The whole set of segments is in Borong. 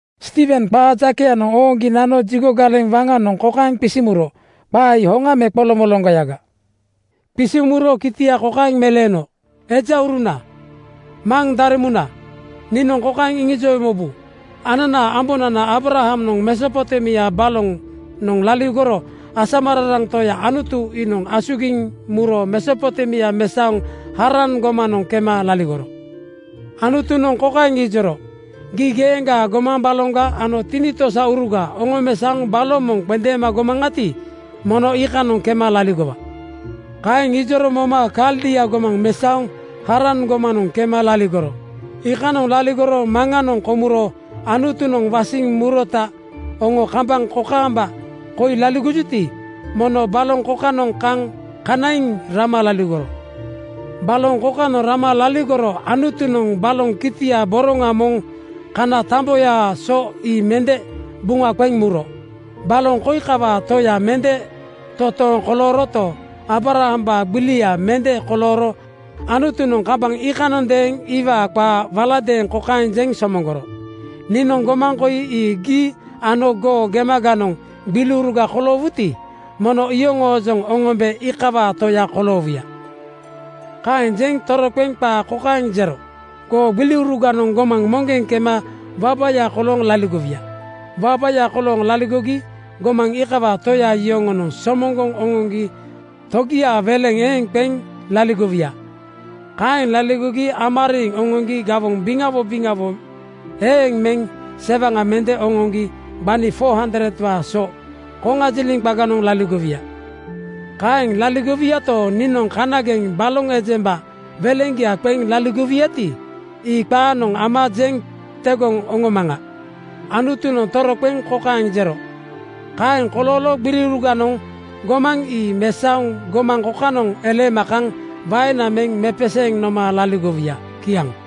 Stiiwen qaa jakeyanoŋ ooŋgi nano jigo galeŋ waŋanoŋ kokaeŋ qisiŋ muro, “Qaa ii hoŋa me qoloŋmoloŋgoyaga?” Qisiŋ muro kitia kokaeŋ meleeno, “Ejauruna, maŋ daremuna, niinoŋ kokaeŋ iŋijowe mobu: Ananaa ambonana Aabrahamnoŋ Mesopotemia balonoŋ laligoro asamararaŋ Toya Anutu iinoŋ asugiŋ muro Mesopotemia mesaoŋ Haran gomanoŋ kema laligoro. Anutunoŋ kokaeŋ ijoro, ‘Gii geeŋgaa gomaŋ baloŋga ano tinitosauruga oŋomesaoŋ baloŋ moŋ qendeema gomaŋati, mono iikanoŋ kema laligowa.’ Kaeŋ ijoro moma Kaldia gomaŋ mesaoŋ Haran gomanoŋ kema laligoro. Iikanoŋ laligoro maŋanoŋ komuro Anutunoŋ wasiŋ murota oŋo kambaŋ kokaamba koi laligojuti, mono baloŋ kokanoŋ kaŋ kanaiŋ rama laligoro. Baloŋ kokanoŋ rama laligoro Anutunoŋ baloŋ kitia boroŋa moŋ kana tamboyaa so ii mende buŋa qeŋ muro. Baloŋ koi kawaa toya mende totooŋ kolooroto, Aabrahambaa gbilia mende kolooro Anutunoŋ kambaŋ iikanondeeŋ iwaa qaa waladeeŋ kokaeŋ jeŋ somoŋgoro, ‘Niinoŋ gomaŋ koi ii gii ano goo gemaganoŋ gbiliuruga koloowuti, mono iyoŋoojoŋ oŋombe iikawaa toya koloowuya.’ Kaeŋ jeŋ toroqeŋ qaa kokaeŋ jero, ‘Goo gbiliuruganoŋ gomaŋ moŋgeŋ kema wabaya kolooŋ laligowuya. Wabaya kolooŋ laligogi gomaŋ iikawaa toya yoŋonoŋ somoŋgoŋ oŋoŋgi togiaa weleŋ eeŋ qeŋ laligowuya. Kaeŋ laligogi ama riiŋ oŋoŋgi gawoŋ biŋawo biŋawo eeŋ megi sewaŋa mende oŋoŋgi gbani 400:waa so koŋajiliŋ qaganoŋ laligowuya. Kaeŋ laligowuyato, niinoŋ kanageŋ baloŋ ejemba weleŋgia qeŋ laligowuyati, ii qaanoŋ ama jeŋ tegoŋ oŋomaŋa.’ Anutunoŋ toroqeŋ kokaeŋ jero, ‘Kaeŋ kolooro gbiliuruganoŋ gomaŋ ii mesaoŋ gomaŋ kokanoŋ eleema kaŋ waena meŋ mepeseeŋ noma laligowuya.’ Kiaŋ.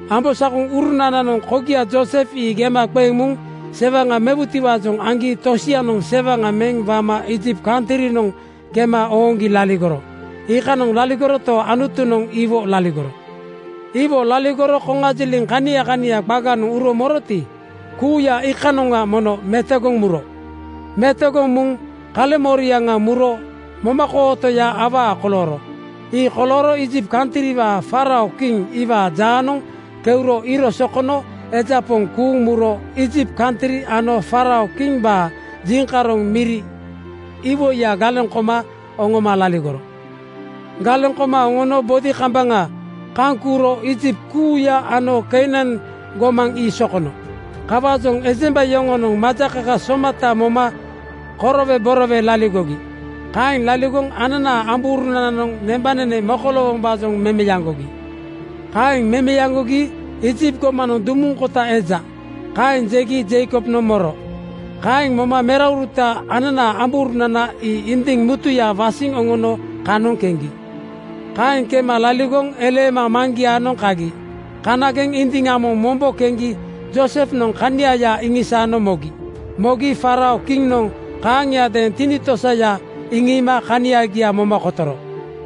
“Ambosakoŋurunananoŋ kogia Joosef ii gema qeŋ muŋ sewaŋa mewutiwaajoŋ aŋgi tosianoŋ sewaŋa meŋ wama Iijipt kantrinoŋ kema ooŋgi laligoro. Iikanoŋ laligoroto, Anutunoŋ iwo laligoro. Iwo laligoro koŋajiliŋ kania kania qaganoŋ uro moroti, kuuya iikanoŋga mono metogoŋ muro. Metogoŋ muŋ kaleŋmoriaŋa muro momakootoya awaa kolooro. Ii kolooro Iijipt kantriwaa faarao kiŋ iwaa jaanoŋ keuro iiro sokono eja poŋ kuuŋ muro Iijipt kantri ano faarao kimbaa jiŋkaroŋ miri iwoiya galeŋ koma oŋoma laligoro. Galeŋ koma oŋono bodi kambaŋa kaŋ kuuro Iijipt kuuya ano Keinan gomaŋ ii sokono. Kawaajoŋ ejemba yoŋonoŋ majakaka somata moma koroweborowe laligogi. Kaeŋ laligoŋ ananaa ambourunananoŋ nembanene mokoloowombaajoŋ memeaŋgogi. “Kaeŋ memeaŋgogi ‘Iijipt gomanoŋ dumuŋ kota eja,’ kaeŋ jegi Jeikobnoŋ moro. Kaeŋ moma merauruta, ananaa ambourunana ii indiŋ mutuya wasiŋ oŋono kanoŋ keŋgi. Kaeŋ kema laligoŋ eleema maŋgiaanoŋ kagi. Kanageŋ indiŋa moŋ mombo keŋgi Joosefnoŋ kaniaya iŋisaano mogi. Mogi faarao kiŋnoŋ kaaŋiadeeŋ tinitosaya iŋiima kaniagia moma kotoro.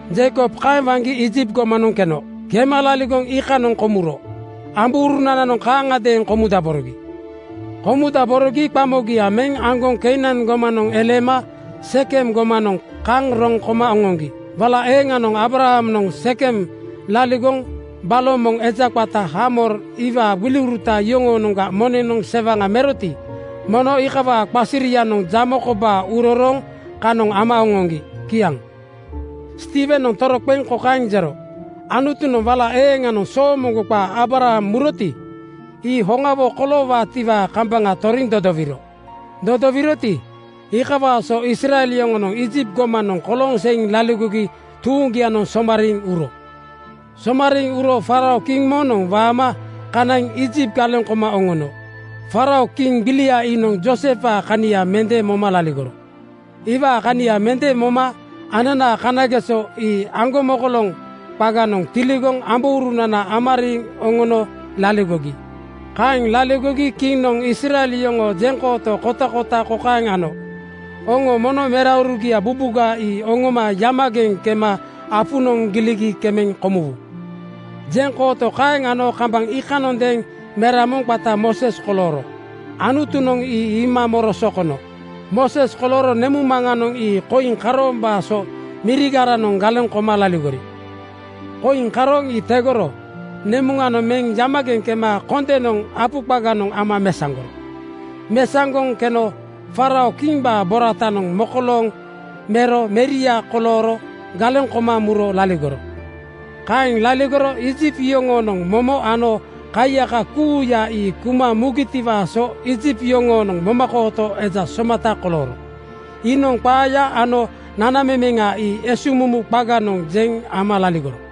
“Jeikob kaeŋ waŋgi Iijipt gomanoŋ keno. Kema laligoŋ iikanoŋ komuro. Ambourunananoŋ kaaŋagadeeŋ komudaborogi. Komudaborogi qamogia meŋ aŋgoŋ Keinan gomanoŋ eleema Sekem gomanoŋ kaŋ roŋ koma oŋoŋgi. Wala eeŋanoŋ Aabrahamnoŋ Sekem (Sikem) laligoŋ baloŋ moŋ eja qata Haamor iwaa gbiliuruta yoŋoonoŋga moneŋnoŋ sewaŋa meroti, mono iikawaa qasirianoŋ jamo kobaa urorooŋ kanoŋ ama oŋoŋgi.” Kiaŋ. Stiiwenoŋ toroqeŋ kokaeŋ jero, “Anutunoŋ wala eeŋanoŋ soomoŋgo qaa Aabraham muroti, ii hoŋawo koloowaatiwaa kambaŋa toriŋ dodowiro. Dodowiroti, iikawaa so Israel yoŋonoŋ Iijipt gomanoŋ kolooŋ seiŋ laligogi tuuŋgianoŋ somariiŋ uro. Somariiŋ uro faarao kiŋ moŋnoŋ waama kanaiŋ Iijipt galeŋ koma oŋono. Faarao kiŋ gbilia iinoŋ Joosefwaa kania mende moma laligoro. Iwaa kania mende moma ananaa kanageso ii aŋgomokoloŋ qaganoŋ tiligoŋ ambourunana ama riiŋ oŋono laligogi. Kaeŋ laligogi kiŋnoŋ Israel yoŋoo jeŋkooto kotakota kokaeŋ ano, ‘Oŋo mono meraurugia bubuga ii oŋoma yamageŋ kema apunoŋ giligi kemeŋ komuwu.’ “Jeŋkooto kaeŋ ano kambaŋ iikanoŋadeeŋ mera moŋ qata Mooses kolooro. Anutunoŋ ii iima moro sokono. Mooses kolooro nemuŋmaŋanoŋ ii koiŋ karoombaa so mirigaranoŋ galeŋ koma laligori. Koiŋ karooŋ ii tegoro nemuŋanoŋ meŋ yamageŋ kema kondenoŋ apu qaganoŋ ama mesaŋgoro. Mesaŋgoŋ keno faarao kimbaa boratanoŋ mokolooŋ mero meria kolooro galeŋ koma muro laligoro. Kaeŋ laligoro Iijipt yoŋoonoŋ momo ano kaiyaka kuuya ii kuma mugitiwaa so Iijipt yoŋoonoŋ momakooto eja somata kolooro. Iinoŋ qaaya ano nanamemeŋa ii esuŋmumu qaganoŋ jeŋ ama laligoro.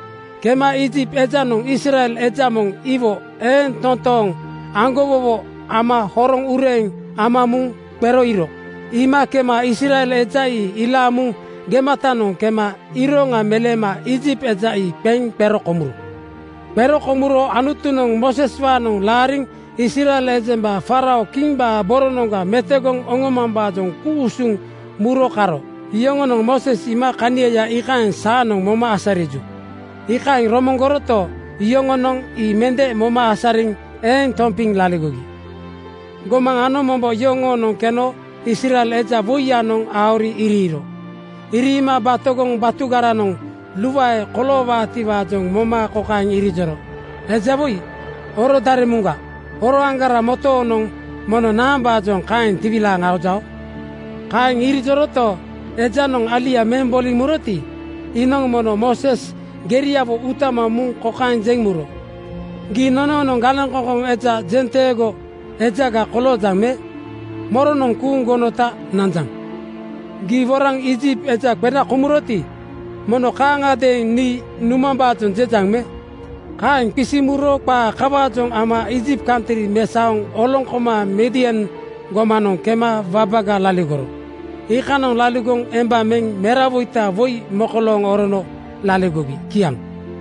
Kema Iijipt ejanoŋ Israel eja moŋ iwo eeŋ toontooŋ aŋgowowo ama horoŋ ureeŋ ama muŋ qero iiro. Iima kema Israel eja ii ilaaŋ muŋ gematanoŋ kema iroŋa meleema Iijipt eja ii qeŋ qero komuro. Qero komuro Anutunoŋ Mooseswaanoŋ laariŋ Israel ejemba faarao kimbaa boronoŋga metogoŋ oŋomambaajoŋ ku-usuŋ muro karo. Yoŋonoŋ Mooses iima kaniaya iikaeŋ saanoŋ moma asariju, iikaeŋ romoŋgoroto, yoŋonoŋ ii mende moma asariŋ eeŋ tompiŋ laligogi. “Gomaŋ ano mombo yoŋoonoŋ keno Israel eja woiyanoŋ aori iriiro. Iriima batogoŋ batugaranoŋ luae koloowaatiwaajoŋ moma kokaeŋ irijoro, ‘Eja woi, oro daremuŋga. Oroaŋgara motoonoŋ mono naambaajoŋ kaeŋ tiwilaaŋ aojao?’ Kaeŋ irijoroto, ejanoŋ alia meŋ boliŋ muroti, iinoŋ mono Mooses geriawo utama muŋ kokaeŋ jeŋ muro, ‘Gii nonoonoŋ galeŋkoŋkoŋ ano jenteego ejaga koloojaŋ me? Moronoŋ kuuŋ gonota nanjaŋ? Gii woraŋ Iijipt eja qena komuroti, mono kaaŋadeeŋ nii numambaajoŋ jejaŋ me?’ Kaeŋ qisiŋ muro qaa kawaajoŋ ama Iijipt kantri mesaoŋ oloŋ koma Midian gomanoŋ kema wabaga laligoro. Iikanoŋ laligoŋ emba meŋ merawoita woi mekolooŋ orono laligogi.” Kiaŋ.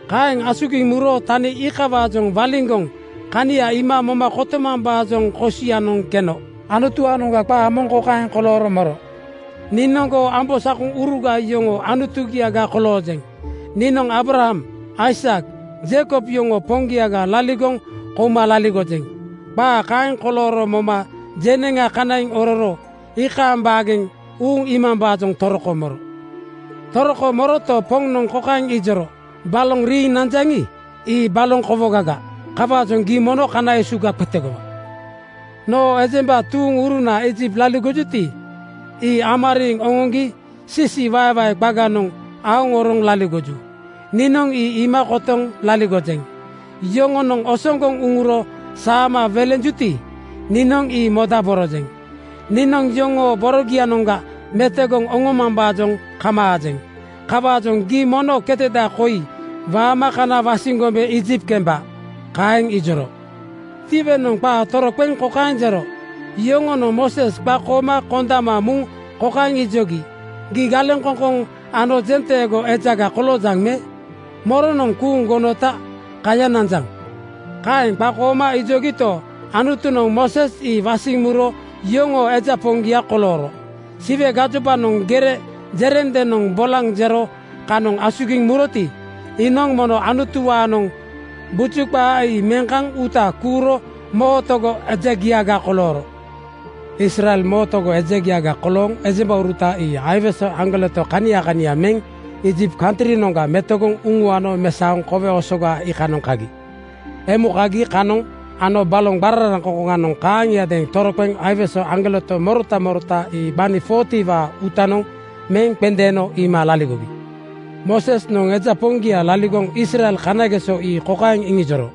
Kaeŋ asugiŋ muro tani iikawaajoŋ waliŋgoŋ kania iima moma kotomambaajoŋ kosianoŋ keno Anutuwaanoŋa qaa moŋ kokaeŋ kolooro moro, ‘Niinoŋ goo ambosakoŋuruga yoŋoo Anutugiaga koloojeŋ. Niinoŋ Aabraham, Aisak, Jeikob yoŋoo Poŋgiaga laligoŋ kouma laligojeŋ.’ Qaa kaeŋ kolooro moma jeneŋa kanaiŋ ororo iikaaŋ baageŋ uuŋ iimambaajoŋ toroko moro. “Toroko moroto, Poŋnoŋ kokaeŋ ijoro, ‘Baloŋ riiŋ nanjaŋi, ii baloŋ kowogaga. Kawaajoŋ gii mono kana esuga qetegowa. Noo ejemba tuuŋuruna Iijipt laligojuti, ii ama riiŋ oŋoŋgi siisiiwaewae qaganoŋ aoŋ oroŋ laligoju. Niinoŋ ii iima kotoŋ laligojeŋ. Yoŋonoŋ osoŋgoŋ uŋuro saama welenjuti, niinoŋ ii modaborojeŋ. Niinoŋ yoŋoo borogianoŋga metogoŋ oŋomambaajoŋ kamaajeŋ. Kawaajoŋ gii mono keteda koi waama kana wasiŋ gombe Iijipt kemba!’ Kaeŋ ijoro.” Stiiwenoŋ qaa toroqeŋ kokaeŋ jero, “Yoŋonoŋ Mooses qakooma kondama muŋ kokaeŋ ijogi, ‘Gii galeŋkoŋkoŋ ano jenteego ejaga koloojaŋ me? Moronoŋ kuuŋ gonota kaya nanjaŋ?’ Kaeŋ qakooma ijogito, Anutunoŋ Mooses ii wasiŋ muro yoŋoo eja poŋgia kolooro. Siwe gajobanoŋ gere jerendenoŋ bolaŋ jero kanoŋ asugiŋ muroti, iinoŋ mono Anutuwaanoŋ buju qaa ii meŋ kaŋ uuta kuuro mootogo ejagiaga kolooro. Israel mootogo ejagia kolooŋ ejembauruta ii aiwese aŋgoleto kania kania meŋ Iijipt kantrinoŋga metogoŋ uŋuano mesaoŋ Kowe Osoga iikanoŋ kagi. Emu kagi kanoŋ ano baloŋ qararaŋkoŋkoŋanoŋ kaaŋiadeeŋ toroqeŋ aiwese aŋgoleto morota morota ii gbani 40:waa uutanoŋ meŋ qendeeno iima laligogi. Moosesnoŋ eja poŋgia laligoŋ Israel kanageso ii kokaeŋ iŋijoro,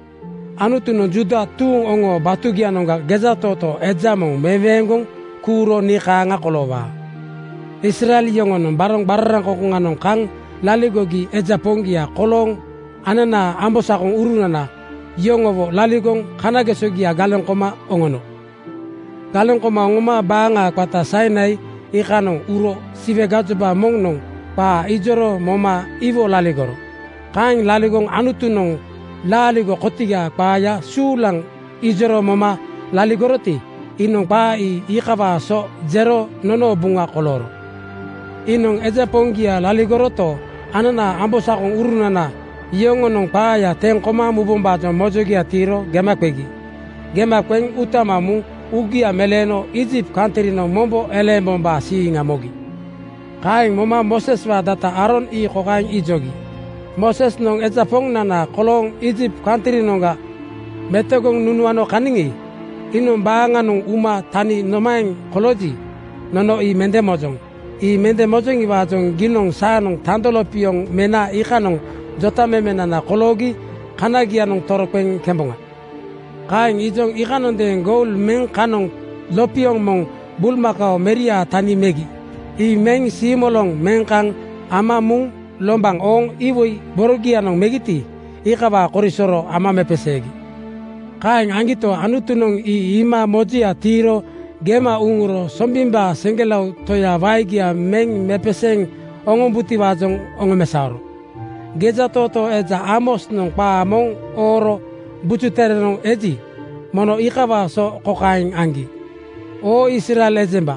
‘Anutunoŋ Juuda tuuŋ oŋoo batugianoŋga gejatootoo eja moŋ meweeŋgoŋ kuuro nii kaaŋa koloowaa.’ “Israel yoŋonoŋ baloŋ qararaŋkoŋkoŋanoŋ kaŋ laligogi eja poŋgia kolooŋ ananaa ambosakoŋurunana yoŋowo laligoŋ kanagesogia galeŋ koma oŋono. Galeŋ koma oŋoma baaŋa qata Sainai iikanoŋ uro Siwe gajoba moŋnoŋ qaa ijoro moma iwo laligoro. Kaeŋ laligoŋ Anutunoŋ laaligo kotigaa qaaya suulaŋ ijoro moma laligoroti, iinoŋ qaa ii iikawaa so jero nonoo Buŋa kolooro. “Iinoŋ eja poŋgia laligoroto, ananaa ambosakoŋurunana yoŋonoŋ qaaya teŋ koma mubombaajoŋ mojogia tiiro gema qegi. Gema qeŋ utama muŋ uugia meleeno Iijipt kantrinoŋ mombo eleembombaa siiŋa mogi. Kaeŋ moma Mooseswaa data Aaron ii kokaeŋ ijogi, ‘Moosesnoŋ eja Poŋnana kolooŋ Iijipt kantrinoŋga metogoŋ nunuano kaniŋi, iinoŋ baaŋanoŋ uma tani nomaeŋ kolooji, nono ii mende mojoŋ. Ii mende mojoŋiwaajoŋ giinoŋ saanoŋ tando lopioŋ mena iikanoŋ jotamemenana koloogi kanagianoŋ toroqeŋ kemboŋa.’ “Kaeŋ ijoŋ iikanondeeŋ goul meŋ kanoŋ lopioŋ moŋ bulmakao meriaa tani megi. Ii meŋ siimoloŋ meŋ kaŋ ama muŋ lombaŋ ooŋ iwoi borogianoŋ megiti, iikawaa korisoro ama mepeseegi. Kaeŋ aŋgito, Anutunoŋ ii iima mojoya tiiro gema uŋuro Sombimbaa seŋgelao Toya waegia meŋ mepeseeŋ oŋombutiwaajoŋ oŋomesaoro. Gejatootoo eja Aamosnoŋ qaa moŋ ooro Buju Terenoŋ eji, mono iikawaa so kokaeŋ aŋgi, ‘Oo Israel ejemba,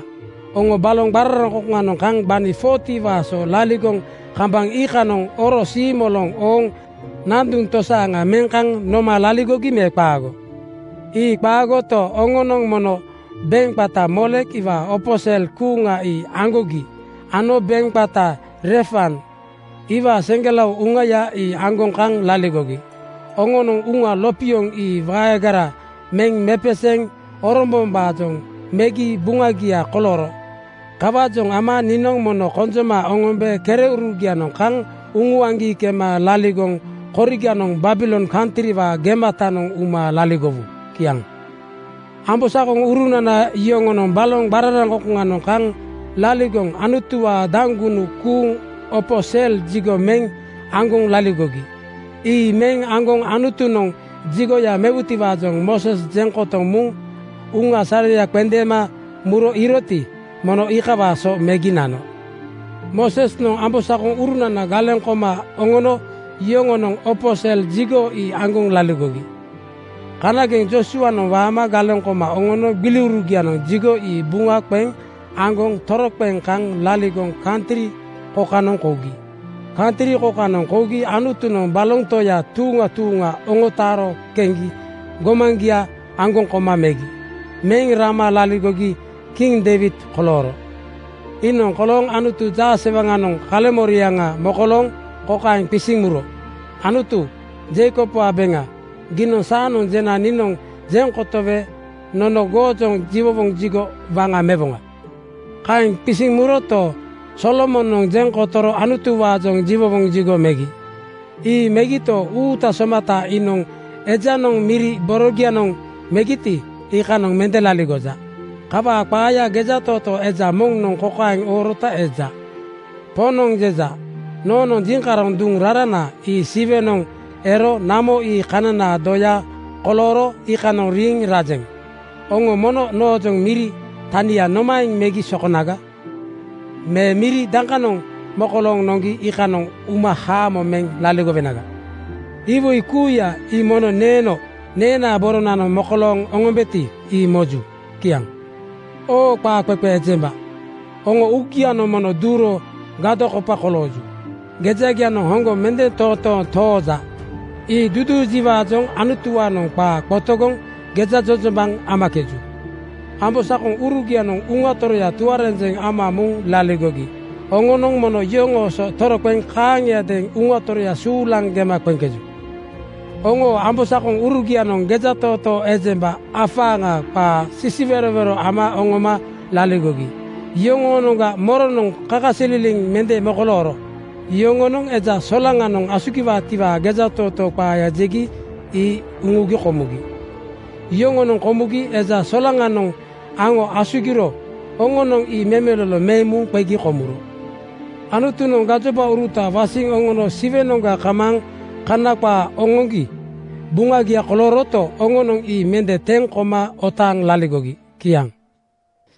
oŋo baloŋ qararaŋkoŋkoŋanoŋ kaŋ gbani 40:waa so laligoŋ kambaŋ iikanoŋ oro siimoloŋ ooŋ nanduŋ tosaaŋa meŋ kaŋ noma laligogi me qaago? Ii qaagoto, oŋonoŋ mono beŋ qata Moolek iwaa opo sel kuuŋa ii aŋgogi ano beŋ qata Refan iwaa seŋgelao uŋaya ii aŋgoŋ kaŋ laligogi. Oŋonoŋ uŋa lopioŋ ii waegara meŋ mepeseeŋ orombombaajoŋ megi buŋagia kolooro. Kawaajoŋ ama niinoŋ mono konjoma oŋombe kereurugianoŋ kaŋ uŋuaŋgi kema laligoŋ koriganoŋ Babilon kantriwaa gematanoŋ uma laligowu.’” Kiaŋ. “Ambosakoŋurunana yoŋonoŋ baloŋ qararaŋkoŋkoŋanoŋ kaŋ laligoŋ Anutuwaa daŋgunu kuuŋ opo sel jigo meŋ aŋgoŋ laligogi. Ii meŋ aŋgoŋ Anutunoŋ jigoya mewutiwaajoŋ Mooses jeŋ kotoŋ muŋ uŋa sareya qendeema muro iiroti, mono iikawaa so megi nano. Moosesnoŋ ambosakoŋurunana galeŋ koma oŋono yoŋonoŋ opo sel jigo ii aŋgoŋ laligogi. Kanageŋ Joosuanoŋ waama galeŋ koma oŋono gbiliurugianoŋ jigo ii buŋa qeŋ aŋgoŋ toroqeŋ kaŋ laligoŋ kantri kokanoŋ kougi. Kantri kokanoŋ kougi Anutunoŋ baloŋ toya tuuŋa tuuŋa oŋotaaro keŋgi gomaŋgia aŋgoŋ koma megi. Meŋ rama laligogi kiŋ Deiwid kolooro. “Iinoŋ kolooŋ Anutu jaasewaŋanoŋ kaleŋmoriaŋa mokolooŋ kokaeŋ qisiŋ muro, ‘Anutu Jeikobwaa beŋa, giinoŋ saanoŋ jena niinoŋ jeŋ kotowe nono goojoŋ jiwowoŋ jigo waŋa mewoŋa.’ Kaeŋ qisiŋ muroto, Solomonoŋ jeŋ kotoro Anutuwaajoŋ jiwowoŋ jigo megi. Ii megito, Uuta Somata iinoŋ ejanoŋ miri borogianoŋ megiti, iikanoŋ mende laligoja. Kawaa qaaya gejatootoo eja moŋnoŋ kokaeŋ oorota eja, ‘Poŋnoŋ jeja: Noonoŋ jiŋkaroŋ duŋ rarana ii Siwenoŋ ero namo ii kananaa doya kolooro iikanoŋ riiŋ rajeŋ. Oŋo mono noojoŋ miri tania nomaeŋ megi sokonaga? Me miri dakanoŋ mokolooŋ noŋgi iikanoŋ uma haamo meŋ laligowenaga? Iwoi kuuya ii mono neeno neenaa boronanoŋ mokolooŋ oŋombeti, ii moju.’” Kiaŋ. “Oo qaaqeqe ejemba, oŋoo uugianoŋ mono duuro gadokopa kolooju. Gejagianoŋ hoŋgoŋ mende totooŋ tooja! Ii duujiwaajoŋ Anutuwaanoŋ qaa qotogoŋ gejajojombaŋ amakeju. Ambosakoŋurugianoŋ Uŋa Toroya tuarenjeŋ ama muŋ laligogi oŋonoŋ mono yoŋoo so toroqeŋ kaaŋiadeeŋ Uŋa Toroya suulaŋ gema qeŋkeju! Oŋoo ambosakoŋurugianoŋ gejatootoo ejemba afaaŋa qaago sisiwerowero ama oŋoma laligogi. Yoŋoonoŋga moronoŋ kakasililiŋ mende mokolooro? Yoŋonoŋ Eja Solaŋanoŋ asugiwaatiwaa gejatootoo qaaya jegi ii uŋugi komugi. Yoŋonoŋ komugi Eja Solaŋanoŋ aŋo asugiro oŋonoŋ ii memelolo meŋ muŋ qegi komuro. Anutunoŋ gajobauruta wasiŋ oŋono Siwenoŋga kamaaŋ Kana qaa oŋoŋgi Buŋagia kolooroto, oŋonoŋ ii mende teŋ koma otaaŋ laligogi.” Kiaŋ.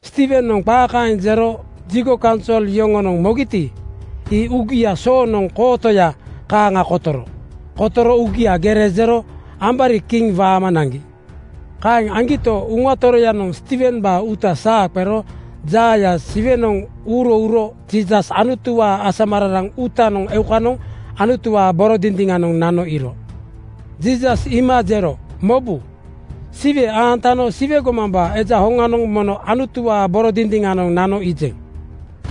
Stiiwenoŋ qaa kaeŋ jero jigo kaunsol yoŋonoŋ mogiti, ii uugia soonoŋ kootoya kaaŋa kotoro. Kotoro uugia gere jero ambari kiŋ waama naŋgi. Kaeŋ aŋgito, Uŋa Toroyanoŋ Stiiwembaa uuta saa qero jaaya Siwenoŋ uuro uro Jiisas Anutuwaa asamararaŋ uutanoŋ eukanoŋ Anutuwaa boro dindiŋanoŋ nano iiro. Jiisas iima jero, “Mobu! Siwe aantano Siwe gomambaa Eja hoŋanoŋ mono Anutuwaa boro dindiŋanoŋ nano iijeŋ.”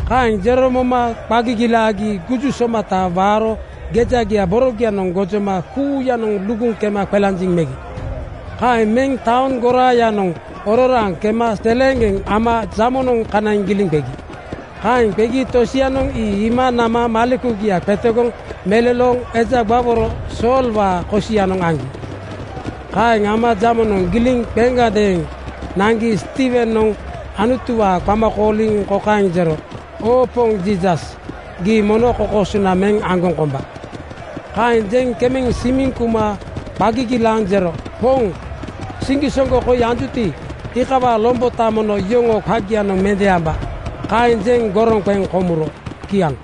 Kaeŋ jero moma qa gigilaagi guju somata waaro gejagia borogianoŋ gojoma kuuyanoŋ luguŋ kema qelanjiŋ megi. Kaeŋ meŋ taoŋ goraayanoŋ ororaaŋ kema seleeŋgeŋ ama jamonoŋ kanaiŋ giliŋ qegi. Kaeŋ qegi tosianoŋ ii iima nama malekugia qetegoŋ melolooŋ eja gbaworo Soolwaa kosianoŋ aŋgi. Kaeŋ ama jamonoŋ giliŋ qeŋgadeeŋ naŋgi Stiiwenoŋ Anutuwaa qama kooliŋ kokaeŋ jero, “Oo Poŋ Jiisas, gii mono kokoosona meŋ aŋgoŋ komba!” Kaeŋ jeŋ kemeŋ simiŋ kuma qa gigilaaŋ jero, “Poŋ, siŋgisoŋgo koi anjuti, iikawaa lombota mono yoŋoo qagianoŋ mende amba!” Kaeŋ jeŋ goroŋ qeŋ komuro. Kiaŋ.